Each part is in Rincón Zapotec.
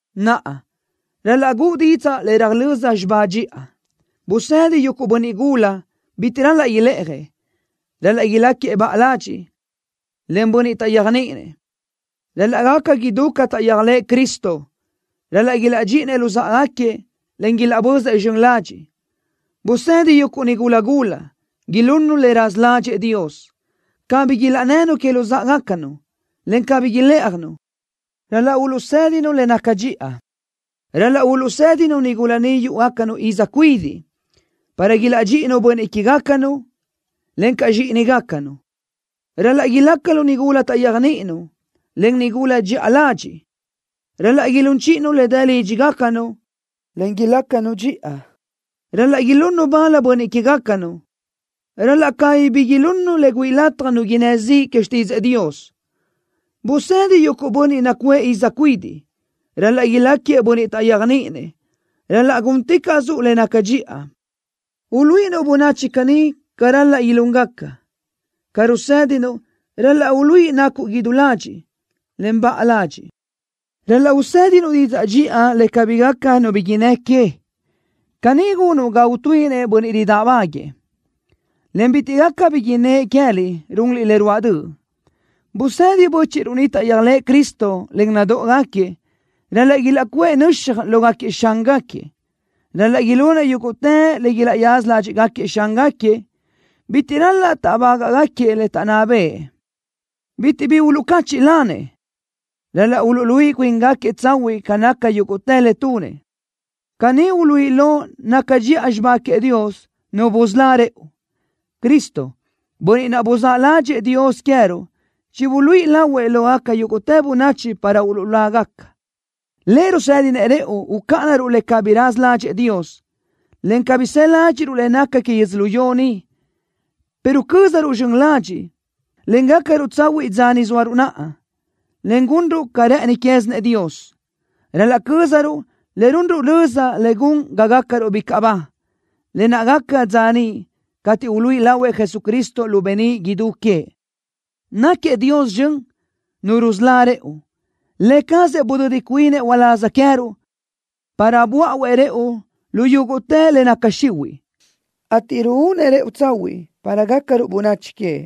Naʼa, ral-laʼ guʼu didzaʼ le röjlö́z xibá dxiʼa. Busedi yuguʼ bönniʼ gula: Bitiʼ ral-laʼ ilë́ʼajëʼ. Ral-laʼ iláquiëʼ baʼa ladxiʼ, en bönniʼ taʼyéajniʼinëʼ. Ral-laʼ gaca idú ca taʼyéajlëʼë Cristo. Ral-laʼ ilaʼdxíʼinëʼ luzáʼagaquiëʼ, en ilaʼbözëʼ zxön ladxiʼ. Busedi yuguʼ nigula gula: Ilunnu le raza ládxëʼë Dios. Cabí ilaʼnnënu que luzáʼagacanu, en cabí ilë́ʼajnu. Ral-laʼ uluʼsédinu le naca dxiʼa. Ral-laʼ uluʼsédinuʼ nigula niʼ yúʼugacanu iz cuidiʼ para ilaʼdxíʼinu bönniʼ que queë́gacanu, encaʼ zxíʼinigacanu. Ral-laʼ ilácanu nigula taʼyéajniʼinu, en nigula dxiʼa ladxiʼ. Ral-laʼ ilún chíʼinu le dë lídxigacanu, en ilácanu dxiʼa. Ral-laʼ ilunnu bal bönniʼ que queë́gacanu. Ral-laʼ cabí bi ilunnu le güíʼi lataj nu innë́ ziʼ que xtídzëʼë Dios. Busedi yuguʼ bönniʼ niʼ nacuʼë iz cuidiʼ: Ral-laʼ ilácagaquiëʼ bönniʼ taʼyéajniʼinëʼ. Ral-laʼ gúnticaʼsuʼ le naca dxiʼa, uluíʼinuʼ bönachi caní ca ral-laʼ ilúngaca. Ca rusédinuʼ ral-laʼ uluíʼi nacuʼ idú ladxiʼ, en baʼa ladxiʼ. Ral-laʼ usédinuʼ didzaʼ dxiʼa le cabí gaca nu bi innë́ que. Caní gunuʼ ga utuíʼinëʼ bönniʼ ridáʼbaguëʼë, en bitiʼ gaca bi innë́ʼ queë́liʼ runliʼ le ruáʼ döʼ. Busedi bö́chiʼruʼ niʼ taʼyéajlëʼë Cristo, en nadóʼogaquiëʼ: Ral-laʼ ilaʼcuʼë nöxaj lógaquiëʼ xángaquiëʼ. Ral-laʼ ilunëʼ yúguʼtë le ilaʼyaza ládxiʼgaquiëʼ xángaquiëʼ. Bitiʼ ral-laʼ táʼbagaʼgaquiëʼ le taʼnná bëʼë. Bitiʼ bi uluʼcáchiʼlanëʼ. Ral-laʼ uluʼluíʼi cuíngaquiëʼ tsahuiʼ ca naca yúguʼtë le tunëʼ. Caní uluíʼi lo naca dxiʼa xibá queëʼ Dios, Nu busölá rëʼu. Cristo, bönniʼ naʼ buzáʼ ládxëʼë Dios queë́ruʼ chibuluíʼi lahuëʼ lógaca yúguʼtë bönachi para uluʼlágaca. Lëʼ rusédinëʼ rëʼu ucáʼanaruʼ le cabí raza ládxëʼë Dios, en cabí së ládxiʼruʼ le naca que yödzölió ni, pero cö́zaruʼ zxön ladxiʼ, en gácaruʼ tsahuiʼ dza ni zóaruʼ naʼa, en gunruʼ ca rë́ʼëni quézinëʼ Dios. Ral-laʼ cö́zaruʼ le runruʼ löza le gun ga gácaruʼ bicaʼ ba, lë naʼ gaca dza niʼ cateʼ uluíʼi lahuëʼ Jesucristo lu beníʼ idú queëʼ. Náquiëʼ Dios zxön, Nu rusölá rëʼu. Lë cazëʼ budödi cuinëʼ uláz queë́ruʼ, para böáʼuëʼ rëʼu lu yúguʼtë le naca xihuiʼ, ateʼ ruúnëʼ rëʼu tsahuiʼ para gácaruʼ bönachi queëʼ,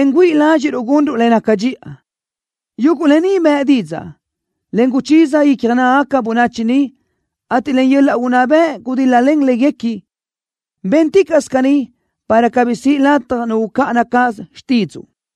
en güíʼi ládxiʼruʼ gunruʼ le naca dxiʼa. Yuguʼ lë ni bëʼ didzaʼ, en guchiza icja nágagaca bönachi niʼ, ateʼ len yöl-laʼ unná bëʼ gudil-la léguequi. Bénticaʼsö caní, para cabí siʼ lataj nu ucáʼana cáʼasö xtídzuʼu.